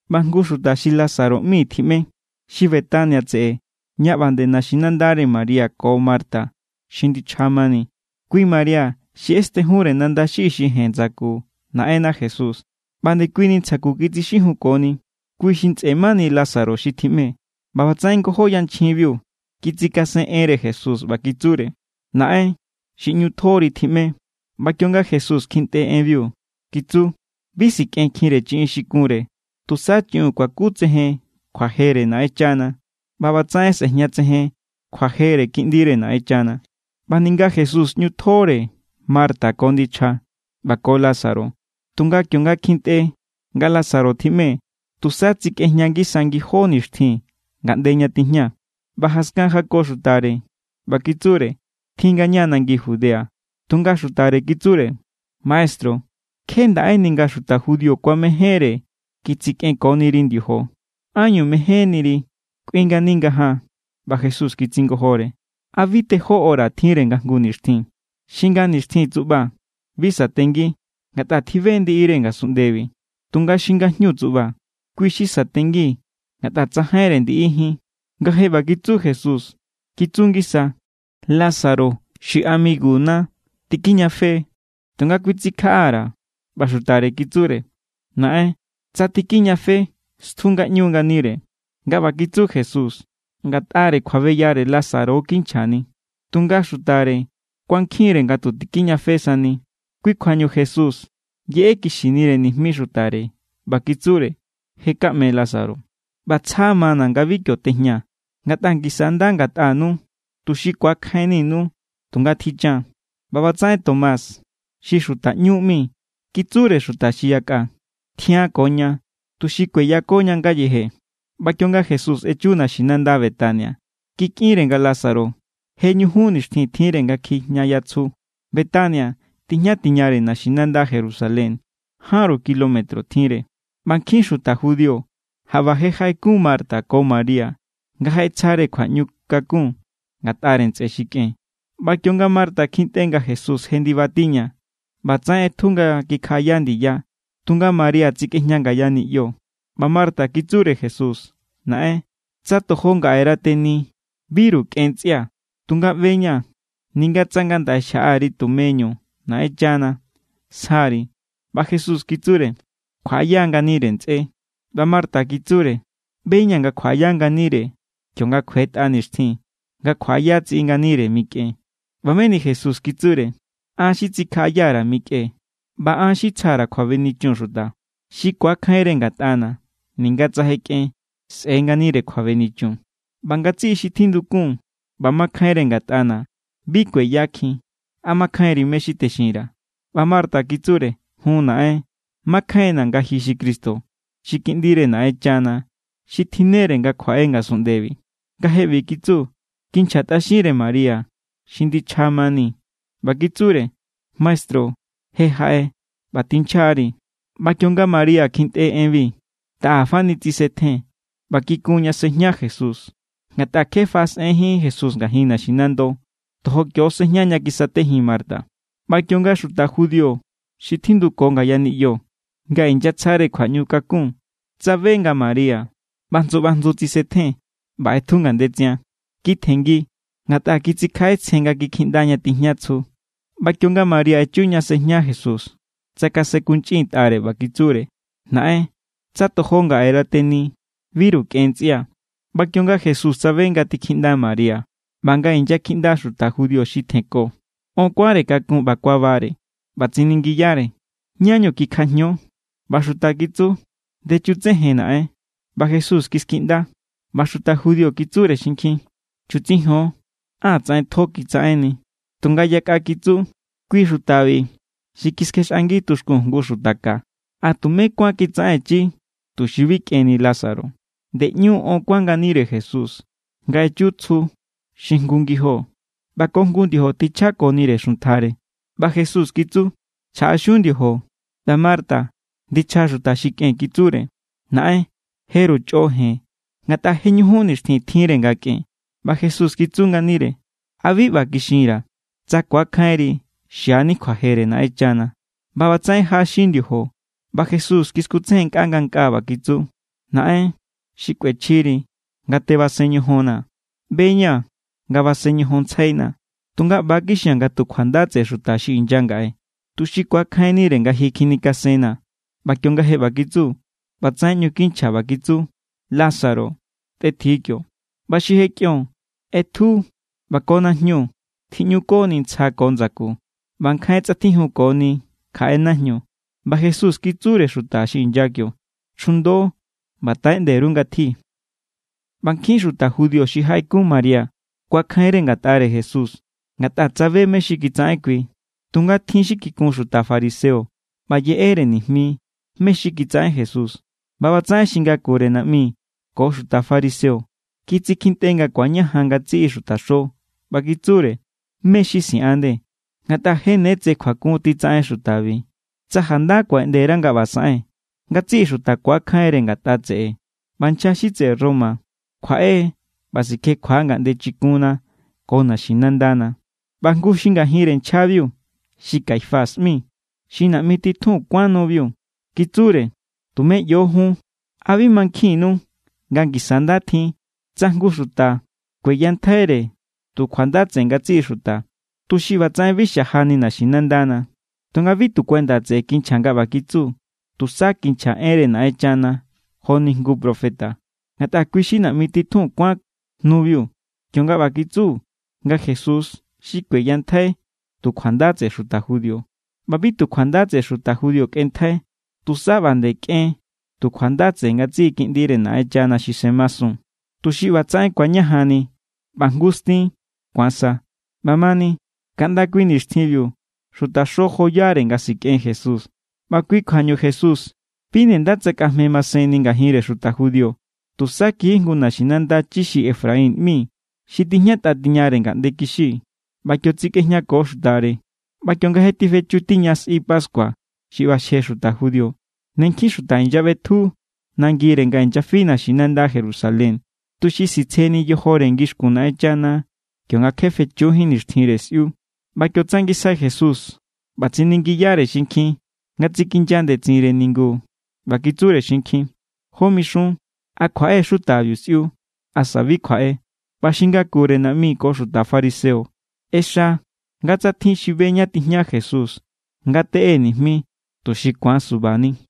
ꞌBa jngu xuta xi Lázaro ꞌmi tjiꞌme, xi Betania tseꞌe ña ꞌba nde naxinandare María ko Marta xi ndichja mani. Kui María xi ꞌestenjunre nanda xi ixi jen ndsaku Naꞌenna Jesús ꞌba ndekuini ntsja ku kitsixijunkoni. Kui xi ntsꞌe mani Lázaro xi tjiꞌme. ꞌBa ꞌbatsaꞌen ngojó yanchjinbiu kitsikasen enre Jesús ꞌba kitsure: —Naꞌen, xi ꞌñu tjori tjiꞌme. ꞌBa kionga Jesús kjintꞌe enbiu, kitsu: —Bi sikꞌenkjinre chiꞌin xi kunre. Tusa chiꞌiun kuakutsejen kjuajere Naꞌenchana, ꞌba ꞌbatsaꞌen sꞌe̱jñatsejen kjuajere Kiꞌndire Naꞌenchana. ꞌBa ninga Jesús ꞌñu tjore Marta ko ndichja ꞌba ko Lázaro, tunga kionga kjintꞌe nga Lázaro tjiꞌme, tusa tsikꞌejña ngisa ngijó nixtjin ngaꞌnde ña tijña. ꞌBa jaskan jako xutare ꞌba kitsure: —Tjin ngaña nangi Judea. Tunga xutare kitsure: —Maestru, kje ndaꞌéni nga xuta judío kuamejénre kitsikꞌenkoniri ndiojo. ¿Ánñu mejénniri kꞌuin ngani ngajaan? ꞌBa Jesús kitsingojore: —¿A bi tejó hora tjinre nga jngu nixtjin? Xi nga nixtjin tsuꞌba, bi satengi, ngatꞌa tjibe= ndiꞌire ngasunꞌndebi. Tunga xi ngajñu tsuꞌba, kui= xi satengi ngatꞌa tsajainre ndiꞌijín. Nga je ꞌba kitsu Jesús, kitsu ngisa: —Lázaro xi amiguna ña tikijñafe=, tunga kuitsikjaꞌa_ra̱. ꞌBa xutare kitsure: —Naꞌen, tsa tikijñafe, stju ngaꞌñu nganire. Nga ꞌba kitsu Jesús, ngatꞌare kjuabeyare Lázaro= kinchjani, tunga xutare kuankjin=re nga tu tikijñafe sani. Kui kjuañu Jesús yeꞌekixinire nijmi xutare ꞌba kitsure: —Je kaꞌme Lázaro. ꞌBa tsja mana̱ nga bi kio tejñaa̱, ngatꞌa ngisa= nda ngatꞌanu, tuxi ku̱akjainninu. Tunga tjichan. ꞌBa ꞌbatsaꞌen Tomás xi xuta ꞌñú ꞌmi kitsure xuta xi yakꞌa: —Tjian ko ña, tuxi kueyakoña ngayeje. ꞌBa kionga Jesús echu naxinanda Betania, kikꞌinre nga Lázaro je ñujun nixtjin tjinre nga kjijñaya tsju. Betania tijña tiñare naxinanda Jerusalén, jánru kilómetro tjinre. ꞌBa nkjin xuta judío jaꞌba je jaꞌekun Marta ko María nga jaꞌetsjare kjuaꞌñu kakun ngatꞌare ntsꞌe xi kꞌen. ꞌBa kionga Marta kjintꞌe nga Jesús je ndibatiña, ꞌbatsaꞌen ꞌetju nga kikjaꞌaya ndiya, tunga María tsikꞌejña ngaya niꞌyo. ꞌBa Marta kitsure Jesús: —Naꞌen, tsa tojo ngaꞌera teni, biru kꞌen ntsꞌia̱. Tunga ꞌbe=ña̱ ninga tsa ngandaꞌe xjaꞌa_ri tumeñu Naꞌenchana, sjaari. ꞌBa Jesús kitsure: —Kjuaꞌaya= nganire ntsꞌé. ꞌBa Marta kitsure: —ꞌBe=ña̱ nga kjuaꞌaya nganire kionga kjuetꞌa nixtjin nga kjuaꞌaya tsiꞌi nganire mikꞌen. ꞌBa meni Jesús kitsure: —An= xi tsikjaꞌayare mikꞌen ꞌba an= xi tsjare kjuabenichun xuta. Xi ku̱akjainre ngatꞌana̱, ninga tsa je kꞌen, sꞌe̱= nganire kjuabenichun. ꞌBa ngatsiꞌi xi tjindukun ꞌba makjainre ngatꞌana̱, bi kueyakjin. ¿A mankjainri mé= xi texinra̱? ꞌBa Marta kitsure: —Jun, naꞌen. Makjainna̱ nga ji= xi Cristo, xi Kiꞌndire Naꞌenchana xi tjinnere nga kjuaꞌe ngasunꞌndebi. Nga je ꞌbi kitsu, kikinchjatꞌaxinre María xi ndichja mani ꞌba kitsure: —Maestru je jaꞌe ꞌba tinchjari. ꞌBa kionga María kjintꞌe enbi, taꞌa fani tsisetjen ꞌba kikun ña sejña Jesús, ngatꞌa kje faꞌasꞌenjín Jesús ngajin naxinando. Tojo kio= sejña ña kisatejin Marta. ꞌBa kionga xuta judío xi tjinduko ngaya niꞌyo nga inyatsjare kjuaꞌñu kakun tsabe nga María ꞌbajndsu ꞌbajndsu tsisetjen ꞌba ꞌetju ngandetsian, kitjenngi, ngatꞌa kitsikjaꞌetsjen nga kikjiꞌnda ña tijña tsju. ꞌBa kionga María echu ña sejña Jesús, tsakasenkunchꞌintꞌare ꞌba kitsure: —Naꞌen, tsa tojo ngaꞌera teni, biru kꞌen ntsꞌia̱. ꞌBa kionga Jesús tsabe nga tikjiꞌnda María ꞌba nga inyakjiꞌnda xuta judío xi tjenko, on kuánre kakun ꞌba kuabare. ꞌBa tsiningiyare: —¿Ñá=ñu kikjajño? ꞌBa xuta kitsu: —Ndechutsejen, naꞌen. ꞌBa Jesús kiskiꞌnda. ꞌBa xuta judío kitsure xinkjin: —Chutsijon. ¡Á tsaꞌen tjo kitsaꞌenni! Tunga yakꞌa kitsu: —Kui xutabi xi kiskjexꞌangi tuxkun jngu xuta ka, ¿a tumé kuán kitsaꞌenchí tuxi bi kꞌenni Lázaro? Nde ꞌnu on kuán nganire Jesús nga echu tsju xi jngu ngijo. ꞌBa ko jngu ndiojo tjichjakoni xuntjare. ꞌBa Jesús kitsu: —Chjaꞌaxiun ndiojo. ꞌBa Marta, ndichja xuta xi kꞌen, kitsure: —Naꞌen, jeru chꞌo jen, ngatꞌa je ñujun nixtjin tjinre nga kꞌen. ꞌBa Jesús kitsu nganire: —¿A bi ꞌba kixinra̱: tsa ku̱akjainri, xiani kjuajere Naꞌenchana? ꞌBa ꞌbatsaꞌen jaꞌaxin ndiojo, ꞌba Jesús kiskutsejennkꞌa ngankꞌaa ꞌba kitsu: —Naꞌen, xikꞌuechjiri nga tebasen ñojonnaa̱. ꞌBe=ña̱ nga basen ñojonntsjainaa̱, tunga ꞌba= kixia̱n nga tu kjuanda tseꞌe xuta xi inya ngaꞌe, tuxi ku̱akjainnire nga ji kjinikasennaa̱. ꞌBa kionga je ꞌba kitsu, ꞌbatsaꞌen ꞌñu kinchja ꞌba kitsu: —¡Lázaro, tꞌetji kio! ꞌBa xi je kꞌion ꞌetju ꞌba ko najñu tjiꞌñukoni ntsja ko ndsaku, ꞌba nkjain tsꞌatjijunkoni kjaꞌe najñu. ꞌBa Jesús kitsure xuta xi inya kio: —Chjundo ꞌba taꞌeꞌnde_ru ngatji. ꞌBa nkjin xuta judío xi jaꞌekun María kuakjainre ngatꞌare Jesús, ngatꞌa tsabe mé= xi kitsaꞌen kui. Tunga tjin xi kikun xuta fariseo ꞌba yeꞌere nijmi mé= xi kitsaꞌen Jesús. ꞌBa ꞌbatsaꞌen xi ngakure naꞌmi ko xuta fariseo kitsikjintꞌe nga ku̱añajan ngatsiꞌi xutaxo ꞌba kitsure: —¿Mé= xi siꞌan nde? Ngatꞌa je ne tse kjuakun titsaꞌen xutabiu. Tsa janda kuaꞌeꞌnde_ra nga ꞌba saꞌen, ngatsiꞌi xuta ku̱akjainre ngatꞌa tseꞌe ꞌba nchja xi tseꞌe Roma kjuaꞌe= ꞌba sikjekjua= ngaꞌnde chikunna ko naxinandana. ꞌBa jngu xi ngajinre nchjabiu xi Caifás ꞌmi, xi naꞌmi titjun kuán nubiu, kitsure: —Tumé ꞌyo jun. ¿A bi mankjinnu nga ngisa= nda tjin tsa jngu xuta kueyantjaire tu kjuanda tseꞌe ngatsiꞌi xuta, tuxi ꞌbatsaꞌen bi xajani naxinandana? Tunga bi tu kuenda tseꞌe kinchja nga ꞌba kitsu. Tusa kinchja enre Naꞌenchana joni jngu profeta. Ngatꞌa kui= xi naꞌmi titjun kuán nubiu, kionga ꞌba kitsu nga Jesús xi kueyantjai tu kjuanda tseꞌe xuta judío. ꞌBa bi tu kjuanda tseꞌe xuta judío kꞌenntjai. Tusa ꞌba nde kꞌen tu kjuanda tseꞌe ngatsiꞌi kiꞌndire Naꞌenchana xi semasun, tuxi ꞌbatsaꞌen ku̱añajanni ꞌba jngu stin ku̱an sa. ꞌBamani, kaꞌnda kui nixtjinbiu xutaxo joyare nga sikꞌen Jesús. ꞌBa kui kjuañu Jesús bi nde nda tsakꞌajme masenni ngajinre xuta judío. Tusa kiji jngu naxinanda chi xi Efraín ꞌmi xi tijñatꞌa tiñare ngaꞌnde kixi. ꞌBa kio tsekꞌejñako xutare. ꞌBa kionga je tifechu tiña sꞌi pascua xi ꞌbaxje xuta judío, ne nkjin xuta inyaꞌbetju nangire nga inyafi naxinanda Jerusalén, tuxi sitsjeni yojore ngixkun Naꞌenchana kionga kje fechujín nixtjinre sꞌiu. ꞌBa kio tsangisjai Jesús ꞌba tsiningiyare xinkjin nga tsikinya ndetsinre ningu ꞌba kitsure xinkjin: —¿Jó mixun? ¿A kjuaꞌe= xutabiu sꞌiu? ¿Asa bi kjuaꞌe? ꞌBa xi ngakure naꞌmi ko xuta fariseo ꞌexa nga tsa tjin xi be ñá tijña Jesús, ngateꞌe nijmi, tuxi ku̱an subani.